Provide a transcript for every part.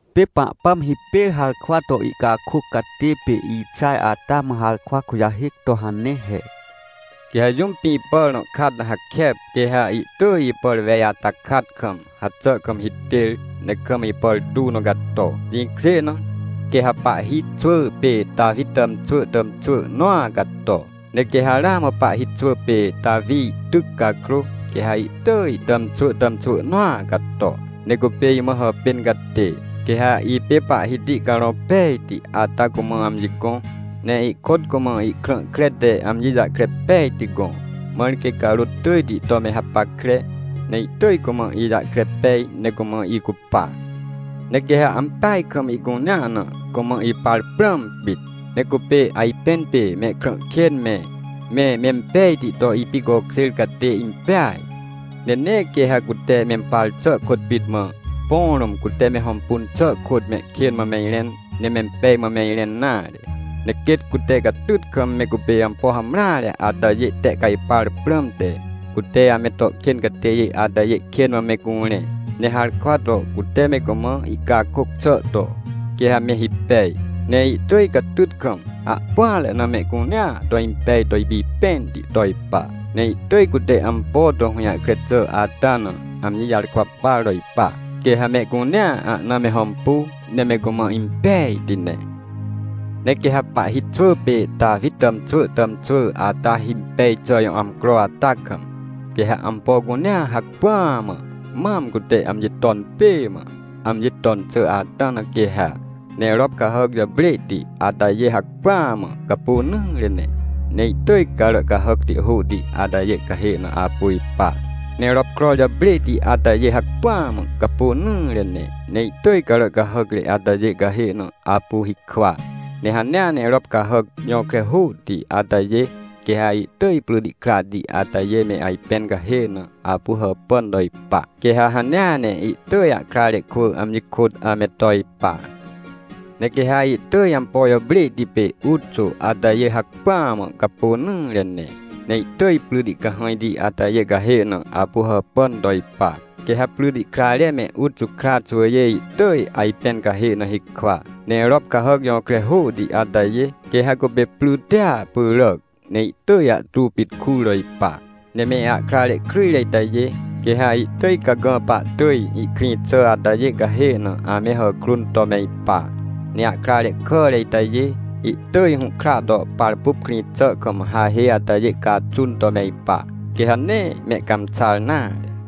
Pê Pahpãm hipêr harkwa to ihcakôc catê pê Ixaj ata mã harkwa kujahêc to hane he: “Quê ha jũm pĩ pàr nõ kat na hakep, quê ha ihtỳj ipàr wej ata kat kam, haxà kam hitêr, ne kam ipàr tuw nõ cato. Jĩkjê na, quê ha pahhi xwỳ pê Tawi tàmxwỳ tàmxwỳ nõa cato. Ne quê ha ramã pahhi xwỳ pê Tawi ihtyc cakrô, quê ha ihtỳj ihtàmxwỳ tàmxwỳ nõa cato, ne cupê imã hàpên catê. “Quê ha ipê Pahhiti Carõ Pejti ata cumã amji gõ, ne ihkôt cumã ihkrã kre te amji jahkre pejti gõ, mãr quê carôt tỳjti to me hapackre, ne ihtỳj cumã ijahkre pej, ne cumã icupa. Ne quê ha ampeaj kam ihcunea na, cumã ipar prãm pit. Ne cupê ajpẽn pê mehkrã kên me, me mempejti to ipicokjêr catê impeaj. Ne nee quê ha cute mempar xà kôt pit mã, põ rũm cute me hõmpun xà kôt mehkên mã me irẽn, ne mempej mã me irẽn nare. Ne quêt cute catyt kam, me cupê ampo hamreare atajê tehcajpar prãmte, cute ame to kên catêjê atajê kên mã me curẽ. Ne harkwa to cute me cumã ihcakôc xà to, quê ha me hipej. Ne ihtỳj catyt kam ahpỹanre na, mehcunea to impej to ipipẽnti to ipa. Ne ihtỳj cute ampo to hũjahkre xà ata na, amji jarkwa par to ipa. Quê ha mehcunea ahna me hõmpu, ne me cumã impejti ne. “Ne quê ha pahhi xwỳ pê Tawi tàmxwỳ tàmxwỳ ata himpej xà jõ amcro ata kam, quê ha ampo cunea hacpỹa mã, mam cute amji ton pê mã, amji ton xà ata na quê ha. Ne rop cahàc jàprêhti atajê hacpỹa mã capônỹre ne, ne ihtỳj carà cahàcti hôhti atajê cahê na apu ipa. Ne ropkror jàprêhti atajê hacpỹa mã capônỹre ne, ne ihtỳj carà cahàcre atajê cahê na apu hikwa. Ne hanea ne rop cahàc jõkre hôhti atajê, quê ha ihtỳj pryti krahti atajê me ajpẽn cahê na apu hàpàn to ipa. Quê ha hanea ne, ihtỳj ahkrare kwỳ amji kôt ame to ipa. Ne quê ha ihtỳj ampo jàprêhti pê uxô atajê hacpỹa mã capônỹre ne, ne ihtỳj pryti cahãjti atajê cahê na apu hàpàn to ipa. Quê ha pryti krare me uxô kra xwỳjê ihtỳj ajpẽn cahê na hikwa. Ne rop cahàc jõkre hôhti atajê, quê ha cupê prytia pyràc, ne ihtỳj ahtu pit kur to ipa. Ne me ahkrare kryjre itajê, quê ha ihtỳj cagã pahtỳj ihkrĩ xà atajê cahê na ame hàkrun to me ipa, ne ahkrare kàre itajê, ihtỳj hũhkra to parpup krĩ xà kam hahê atajê caxun to me ipa, quê ha nee mehcãmxar nare.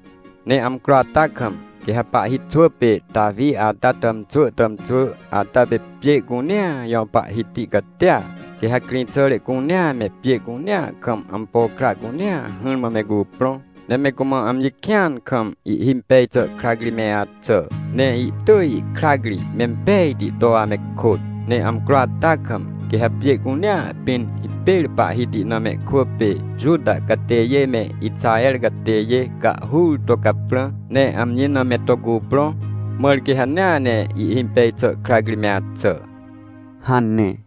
“Ne amcro ata kam, quê ha pahhi xwỳ pê Tawi ata tàmxwỳ tàmxwỳ ata pê pjê cunea jõ Pahhiti catia. Quê ha krĩxàre cunea me, pjê cunea kam ampo kra cunea, hỹrmã me cuprõ, ne me cumã amji kĩan kam ihhimpej xà krac ri me axà. Ne ihtỳj ihkrac ri mempejti to ame kôt. Ne amcro ata kam, quê ha pjê cunea pĩn, hipêr Pahhiti na mehkwỳ pê Juta catêjê me Ixaher catêjê cahhur to caprã, ne amji na me to cuprõ, mãr quê hanea ne ihhimpej xà krac ri me axà” hane.